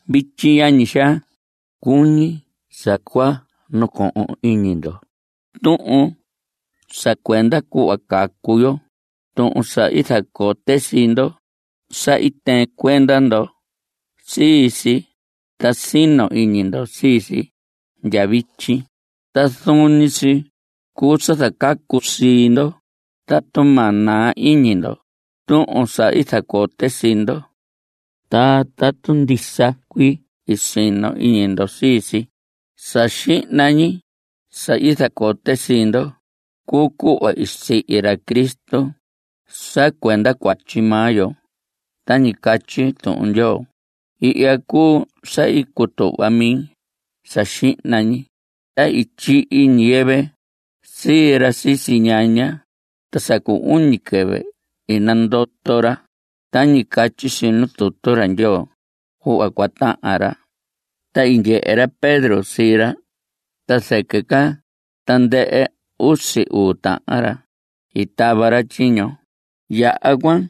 Vityi, yañi xaa, cuñi sa cua nacohon iñi ndo tuhun sa cuenda cuhva cacu yo, tuhun sa i zacote sii ndo. Sa i tɨɨn cuenda ndo sii si, ta sino iñi ndo sii si ndya vityi. Ta zuun ñi si cuu sa zacacu sii ndo tatu ma naa iñi ndo tuhun sa zacote sii ndo, ta tatu ndisa cuii i sino iñi ndo sii si. Sa xihna ñi sa i zacote sii ndo cuu cuhva i sihi ra Cristo sa cuenda cuatyi maa yo tañi catyi Tuhun Ndyoo. Ihya cuu sa i cutuhva mi sa xihna ñi. Ta i tyihi ñiyɨvɨ sii ra sisi ñaña, ta sa cu uñi quɨvɨ i nandoto ra tañi catyi si nu tutu ra Ndyoo cuhva cua tahan ra. Ta i ndyehe ra Pedro sii ra ta zɨquɨ ca tandɨhɨ usi uu tahan ra i tava ra tyiño. Yaha cuan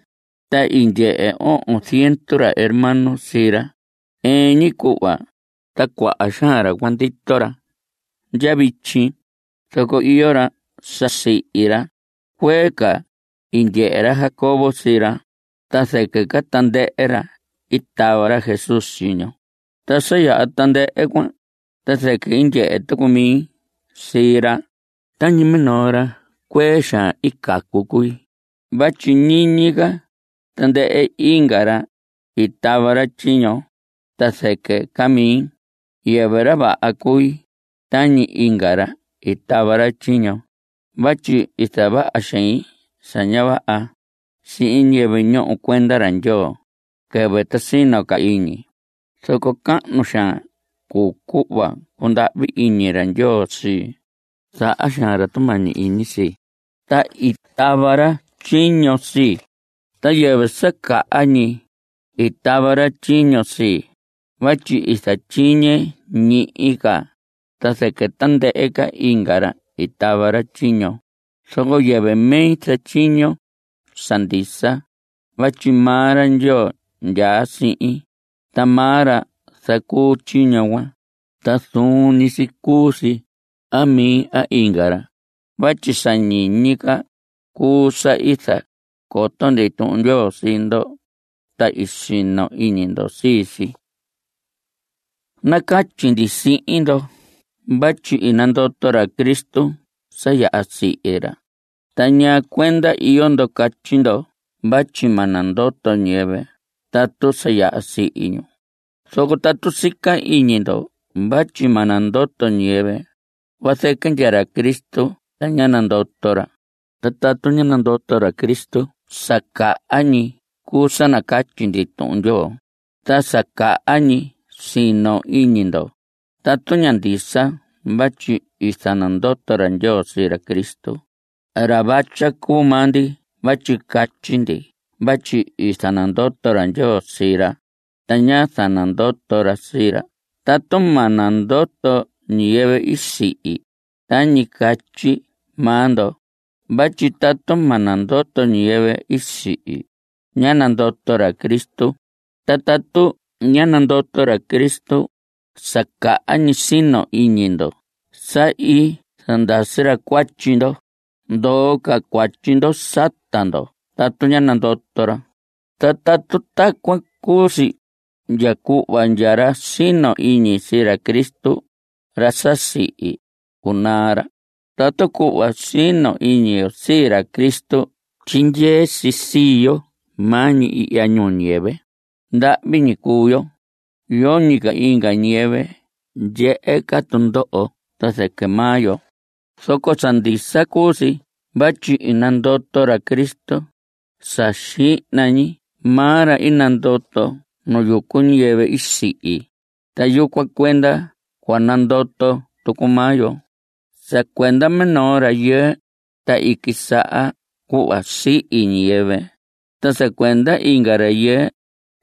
ta i ndyehe ohon ziendu ra hermano sii ra ɨɨn ñi cuhva. Ta cuaha xaan ra cuan ndito ra ndya vityi, zoco iyo ra sa sihi ra. Cuee ca i ndyehe ra Jacobo sii ra, ta zɨquɨ ca tandɨhɨ ra i tava ra Jesús tyiño. Ta sa yaha tandɨhɨ cuan ta zɨquɨ i ndyehe tucu mi sii ra. Tañi minoo ra cuee xaan i cacu cui. Vatyi ñiñi ca tandɨhɨ inga ra i tava ra tyiño ta zɨquɨ ca mi. Yɨvɨ ra vaha cui tañi inga ra i tava ra tyiño vatyi i zavaha xein sa ña vaha sihin ñiyɨvɨ ñoho cuenda ra Ndyoo quɨvɨ ta sino ca iñi. Zoco cahnu xaan cuu cuhva cundahvi iñi ra Ndyoo sii. Zaha xaan ra tumañi iñi sii, ta i tava ra tyiño sii. Ta yɨvɨ sa caha ñi i tava ra tyiño sii vatyi i zatyiñe ñihi ca ta zɨquɨ tandɨhɨ inga ra i tava ra tyiño. Zoco yɨvɨ mi zatyiño sa ndisa vatyi maa ra Ndyoo ndyaa sihin, ta maa ra zacuu tyiño cuan. Ta zuun ñi si cuu si a mi a inga ra vatyi sa ñiñi ca cuu sa i zacoto ndi Tuhun Ndyoo sii ndo, ta i sino iñi ndo sii si. Nacatyi ndi sihin ndo vatyi i nandoto ra Cristo sa yaha i sihi ra. ¿Ta ñaa cuenda iyo ndo catyi ndo vatyi ma nandoto ñiyɨvɨ tatu sa yaha i sihi ñu? Zoco tatu sica iñi ndo vatyi ma nandoto ñiyɨvɨ, vazɨquɨ ndya ra Cristo ta ñá nandoto ra. Ta tatu ñá nandoto ra Cristo, sa caha ñi cuu sa nacatyi ndi Tuhun Ndyoo, ta sa caha ñi sino iñi ndo. Tatu ña ndisa vatyi i zanandoto ra Ndyoo sii ra Cristo, ra vatya cuu maa ndi vatyi catyi ndi vatyi i zanandoto ra Ndyoo sii ra. Ta ñá zanandoto ra sii ra tatu ma nandoto ñiyɨvɨ i sihi, (tañi catyi maa ndo). Vatyi tatu ma nandoto ñiyɨvɨ i sihi, ñá nandoto ra Cristo. Ta tatu ñá nandoto ra Cristo, sa caha ñi sino iñi ndo sa i zandasi ra cuatyi ndo. Ndoo ca cuatyi ndo sata ndo tatu ñá nandoto ra. Ta tatu tacuan cuu si, ndya cuhva ndya ra sino iñi sii ra Cristo, ra sa sihi, cunaa ra. Tatu cuhva sino iñi yo sii ra Cristo tyindyee si sii yo maa ñi ihya ñuu ñiyɨvɨ, ndahvi ñi cuu yo. Yoñi ca inga ñiyɨvɨ ndyehe ca tundoho ta zɨquɨ maa yo. Zoco sa ndisa cuu si vatyi i nandoto ra Cristo. Sa xihna ñi maa ra i nandoto nu yucu ñiyɨvɨ i sihi, ta yucuan cuenda cua nandoto tucu maa yo. Sa cuenda minoo rayɨɨ, ta i quisaha cuhva sihi ñiyɨvɨ. Ta sa cuenda inga rayɨɨ,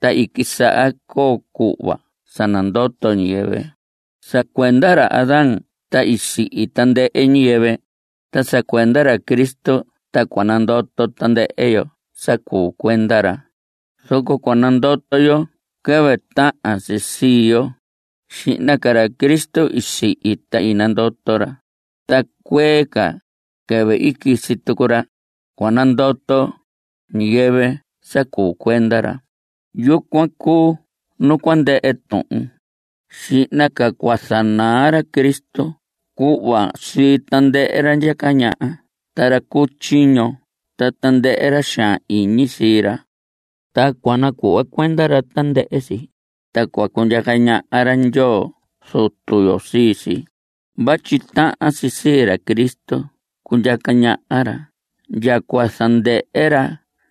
ta i quisaha coo cuhva sa nandoto ñiyɨvɨ. Sa cuenda ra Adán ta sihi tandɨhɨ ñiyɨvɨ. Ta sa cuenda ra Cristo ta cua nandoto tandɨhɨ yo sa cuu cuenda ra. Zoco cua nandoto yo quɨvɨ tahan si sii yo. Xihna ca ra Cristo i sihi ta i nandoto ra, ta cuee ca, quɨvɨ quisi tucu ra, cua nandoto ñiyɨvɨ sa cuu cuenda ra. Yucuan cuu nu cua ndɨhɨ tuhun. Xihna ca cua zanaa ra Cristo cuhva sii tandɨhɨ ra ndyaca ñaha ta ra cu tyiño ta tandɨhɨ ra xaan iñi sii ra. Ta cua nacuhva cuenda ra tandɨhɨ si, ta cua cundyaca ñaha ra Ndyoo Zutu yo sii si. Vatyi tahan si sii ra Cristo cundyaca ñaha ra ndya cua zandɨhɨ ra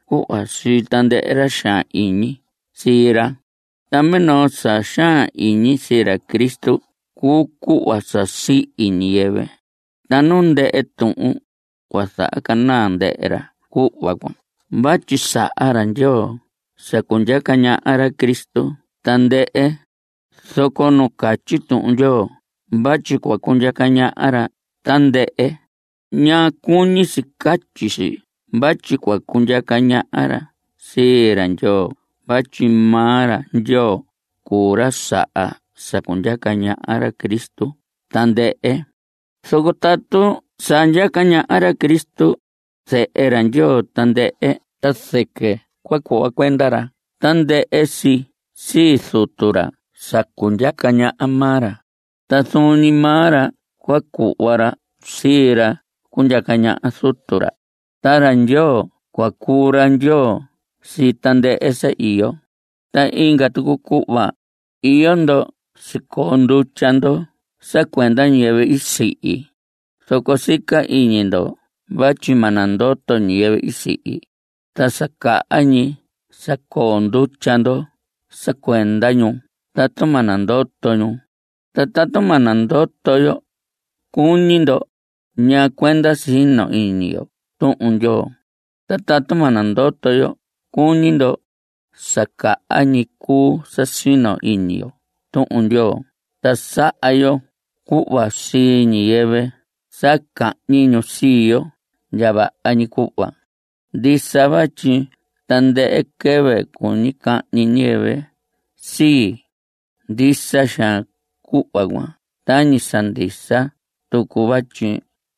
cuhva sii tandɨhɨ ra xaan iñi sii ra. Ta minoo sa xaan iñi sii ra Cristo cuu cuhva sa sihi ñiyɨvɨ. Ta nu ndɨhɨ tuhun, cua zanaa ndɨhɨ ra cuhva cuan vatyi i saha ra Ndyoo sa cundyaca ñaha ra Cristo tandɨhɨ. Zoco nu catyi Tuhun Ndyoo vatyi cua cundyaca ñaha ra tandɨhɨ, ña cuñi si catyi si vatyi cua cundyaca ñaha ra sii ra Ndyoo vatyi maa ra Ndyoo cuu ra saha sa cundyaca ñaha ra Cristo tandɨhɨ. Zoco tatu sa ndyaca ñaha ra Cristo, zehe ra Ndyoo, tandɨhɨ ta zɨquɨ cua cuhva cuenda ra tandɨhɨ si sii Zutu ra sa cundyaca ñaha maa ra, ta zuun ñi maa ra cua cuhva ra sii ra cundyaca ñaha Zutu ra. Ta ra Ndyoo cua cuu ra Ndyoo sii tandɨhɨ sa iyo. Ta inga tucu cuhva; iyo ndo sicoo ndutya ndo sa cuenda ñiyɨvɨ i sihi. Zoco sica iñi ndo vatyi ma nandoto ñiyɨvɨ i sihi, ta sa caha ñi sa coo ndutya ndo sa cuenda ñu tatu ma nandoto ñu. Ta tatu ma nandoto yo cuñi ndo, ¿ñaa cuenda sino iñi yo Tuhun Ndyoo? Ta tatu ma nandoto yo cuñi ndo, sa caha ñi cuu sa sino iñi yo Tuhun Ndyoo ta saha yo cuhva sii ñiyɨvɨ sa cahñi ñu sii yo ndya vaha ñi cuhva. Ndisa vatyi tandɨhɨ quɨvɨ cuñi cahñi ñiyɨvɨ sii. Ndisa xaan cuhva cuan tañi sa ndisa tucu vatyi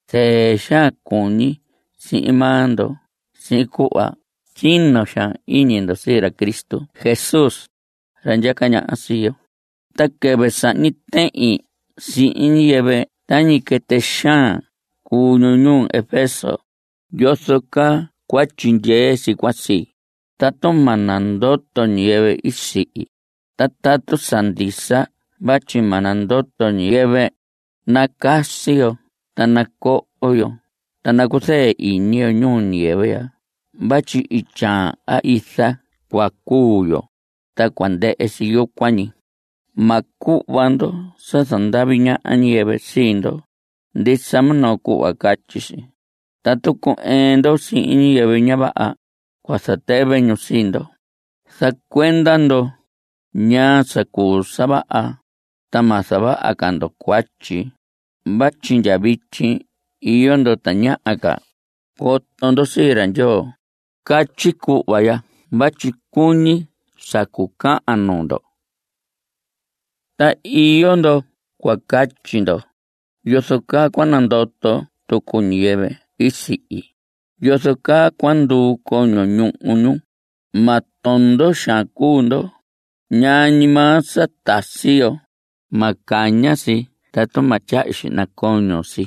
zɨɨ xaan cuñi sihin maa ndo sihin cuhva sino xaan iñi ndo sii ra Cristo Jesús, ra ndyaca ñaha sii yo. Ta quɨvɨ sahñi tehin sihin ñiyɨvɨ tañi quɨtɨ xaan cuu ñu ñuu Efeso ¿yozo caa cua tyindyee si cuan sii, tatu ma nandoto ñiyɨvɨ i sihi? Ta tatu sa ndisa vatyi ma nandoto ñiyɨvɨ, nacasi yo ta nacoho yo ta nacuzɨɨ iñi yo ñuu ñiyɨvɨ ya vatyi ityaan a iza cua cuu yo, ta cua ndɨhɨ si yucuan ñi. Ma cuhva ndo sa zandavi ñaha ñiyɨvɨ sii ndo. Ndisa minoo cuhva catyi si: “Tatu cu‑ɨɨn ndo sihin ñiyɨvɨ ña vaha, cua zatɨvɨ ñu sii ndo.” Zaha cuenda ndo ñaa sa cuu sa vaha, ta ma zavaha ca ndo cuatyi vatyi ndya vityi iyo ndo tañaha ca coto ndo sii ra Ndyoo. Catyi cuhva ya vatyi cuñi sa cucahan nuu ndo. Ta iyo ndo cua catyi ndo: ¿Yozo caa cua nandoto tucu ñiyɨvɨ i sihi? ¿Yozo caa cua nduu coño ñuhu ñu? Ma tondo xaan cuu ndo. Ñaa ñi maa sa tasi yo, ma caña si tatu ma tyahyu xihna coño si.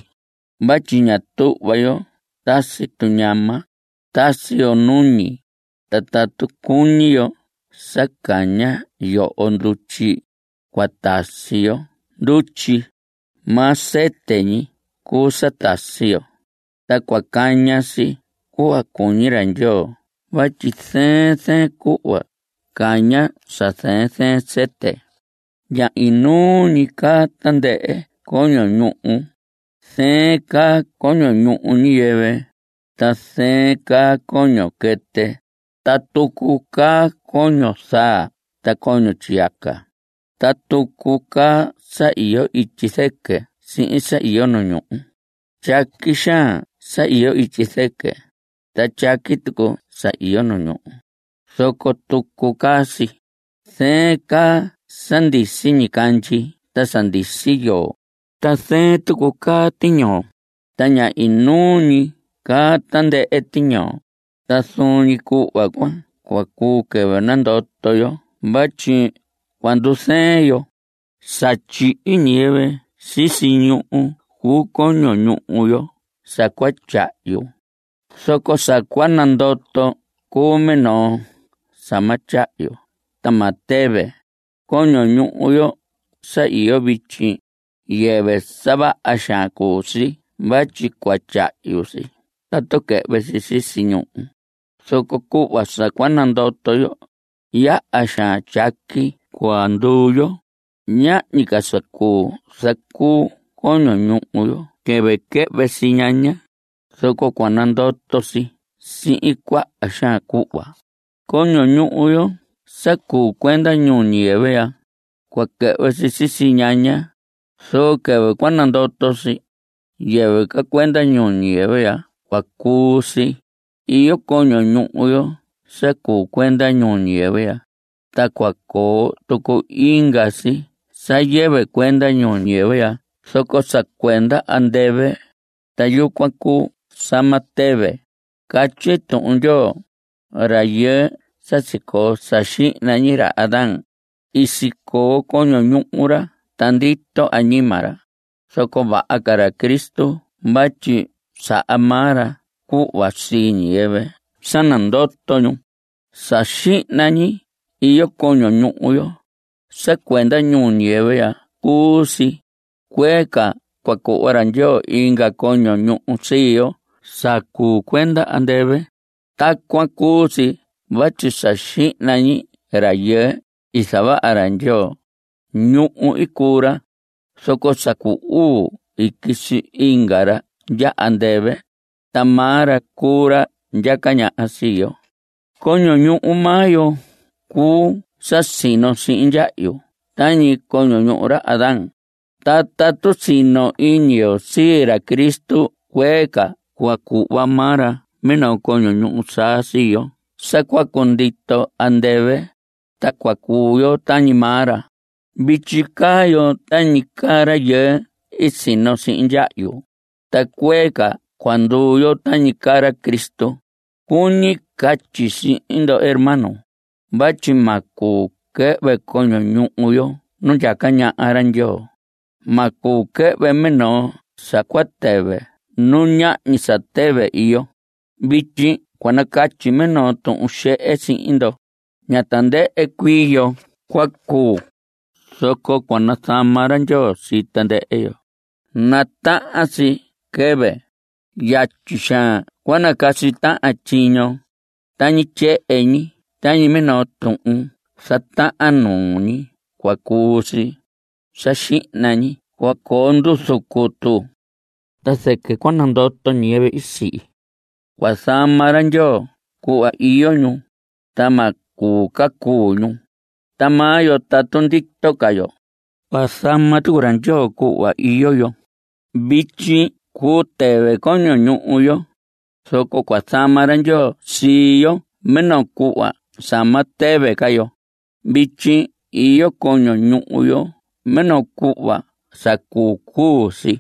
Vatyi ña tuhva yo tasi tuñama, tasi yo nuñi. Ta tatu cuñi yo sa caña yoho ndutyi, cua tasi yo ndutyi. Maa sɨtɨ ñi cuu sa tasi yo. Ta cua caña si cuhva cuñi ra Ndyoo vatyi zɨɨn zɨɨn cuhva caña sa zɨɨn zɨɨn sɨtɨ. Ña inuu ñi caa tandɨhɨ coño ñuhu. Zɨɨn caa coño ñuhu ñiyɨvɨ, ta zɨɨn caa coño quɨtɨ. Ta tucu caa coño zaa ta coño tyiyaca. Ta tucu caa sa iyo ityi zɨquɨ sihin sa iyo nu ñuhu. Tyaqui xaan sa iyo ityi zɨquɨ, ta tyaqui tucu sa iyo nu ñuhu, zoco tucu caa si. Zɨɨn caa sa ndisi ñicandyi ta sa ndisi yoo, ta zɨɨn tucu caa tiñoo. Ta ña inuu ñi caa tandɨhɨ tiñoo. Ta zuun ñi cuhva cuan cua cuu quɨvɨ nandoto yo vatyi cua ndu‑zɨɨn yo. Sa tyihi ñiyɨvɨ sisi ñuhu cuu coño ñuhu yo sa cua tyahyu, zoco sa cua nandoto cuu minoo sa ma tyahyu ta ma tɨvɨ. Coño ñuhu yo sa iyo vityi, yɨvɨ sa vaha xaan cuu si vatyi cua tyahyu si tatu quɨhvɨ si sisi ñuhu, zoco cuhva sa cua nandoto yo, yaha xaan tyaqui cua nduu yo. Ñahñi ca sa cuu zacuu coño ñuhu yo quɨvɨ quɨhvɨ si ñaña, zoco cua nandoto si sihin cuaha xaan cuhva. Coño ñuhu yo sa cuu cuenda ñuu ñiyɨvɨ ya, cua quɨhvɨ si sisi ñaña, zoco quɨvɨ cua nandoto si, yɨvɨ ca cuenda ñuu ñiyɨvɨ ya cua cuu si. Iyo coño ñuhu yo sa cuu cuenda ñuu ñiyɨvɨ ya, ta cua coo tucu inga si sa yɨvɨ cuenda ñuu ñiyɨvɨ ya zoco sa cuenda andɨvɨ. Ta yucuan cuu sa ma tɨvɨ. Catyi Tuhun Ndyoo: “Rayɨɨ sa sicoo sa xihna ñi, ra Adán, i sicoo coño ñuhu ra ta ndito añima ra”, zoco vaha ca ra Cristo vatyi saha maa ra cuhva sii ñiyɨvɨ sa nandoto ñu. Sa xihna ñi iyo coño ñuhu yo. Sa cuenda ñuu ñiyɨvɨ ya cuu si. Cuee ca cua cuhva ra Ndyoo inga coño ñuhu sii yo sa cuu cuenda andɨvɨ. Tacuan cuu si vatyi sa xihna ñi rayɨɨ i zavaha ra Ndyoo, ñuhu i cuu ra. Zoco sa cuu uu i quisi inga ra ndya andɨvɨ. Ta maa ra cuu ra ndyaca ñaha sii yo. Coño ñuhu maa yo cuu sa sino sihin ndyahyu tañi coño ñuhu ra Adán, ta tatu sino iñi yo sii ra Cristo cuee ca cua cuhva maa ra minoo coño ñuhu saa sii yo sa cua cundito andɨvɨ, ta cua cuu yo tañi maa ra. Vityi caa yo tañi caa rayɨɨ i sino sihin ndyahyu, ta cuee ca cua nduu yo tañi caa ra Cristo. Cuñi catyi sihin ndo hermanos, vatyi ma cuu quɨhvɨ coño ñuhu yo nu ndyaca ñaha ra Ndyoo. Ma cuu quɨhvɨ minoo sa cua tɨvɨ nu ñahñi sa tɨvɨ iyo. Vityi cua nacatyi minoo tuhun xehe sihin ndo. Ña tandɨhɨ cuii yo cua cuu, zoco cua nazama ra Ndyoo sii tandɨhɨ yo. Natahan si quɨvɨ, yatyi xaan cua nacasi tahan tyiño; tañi tyehen ñi, tañi minoo tuhun zatahan nuu ñi cua cuu si. Sa xihna ñi cua coo nduzu cutu, ta zɨquɨ cua nandoto ñiyɨvɨ i sihi. Cua zama ra Ndyoo cuhva iyo ñu, ta ma cuu ca ñu. Ta maa yo tatu ndito ca yo, cua zama tucu ra Ndyoo cuhva iyo yo. Vityi cuu tɨvɨ coño ñuhu yo, zoco cua zama ra Ndyoo sii yo minoo cuhva sa ma tɨvɨ ca yo. Vityi iyo coño ñuhu yo minoo cuhva sa cuu cuu si,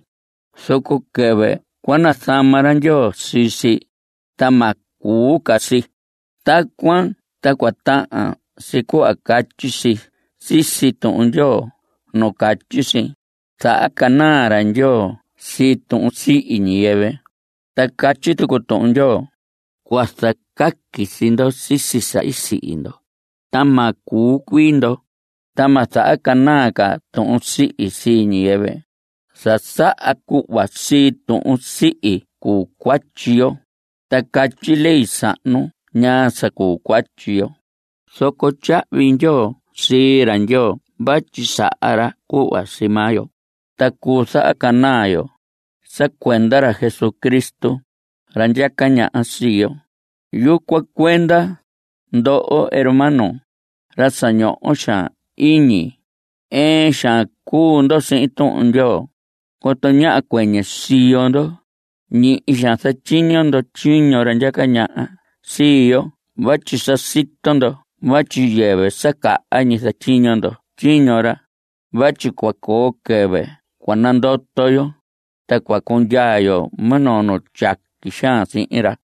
zoco quɨvɨ cua nazama ra Ndyoo sii si, ta ma cuu ca si. Tacuan ta cua tahan si cuhva catyi si sisi Tuhun Ndyoo nu catyi si: “Zahacanaa ra Ndyoo sii tuhun sihi ñiyɨvɨ.” Ta catyi tucu Tuhun Ndyoo: “Cua zacaqui sii ndo sisi sa i sihi ndo, ta ma cuu cuii ndo. Ta ma zahacanaa ca tuhun sihi sii ñiyɨvɨ.” Sa saha cuhva sii tuhun sihi cuu cuatyi yo. Ta catyi ley sahnu ñaa sa cuu cuatyi yo. Zoco tyahvi ndyoo sii ra Ndyoo vatyi saha ra cuhva sii maa yo, ta cuu zahacanaa yo sa cuenda ra Jesucristo, ra ndyaca ñaha sii yo. Yucuan cuenda, ndoho hermanos, ra sa ñoho xaan iñi, ɨɨn xaan cuu ndo sihin Tuhun Ndyoo. Coto ñáha cuɨñɨ siyo ndo. Ñihi xaan zatyiño ndo tyiño ra ndyaca ñaha sii yo vatyi sa sito ndo vatyi yɨvɨ sa caha ñi zatyiño ndo tyiño ra. (Vatyi cua coo quɨvɨ cua nandoto yo, ta cua cundyaa yo minoo nu tyaqui xaan sihin ra.)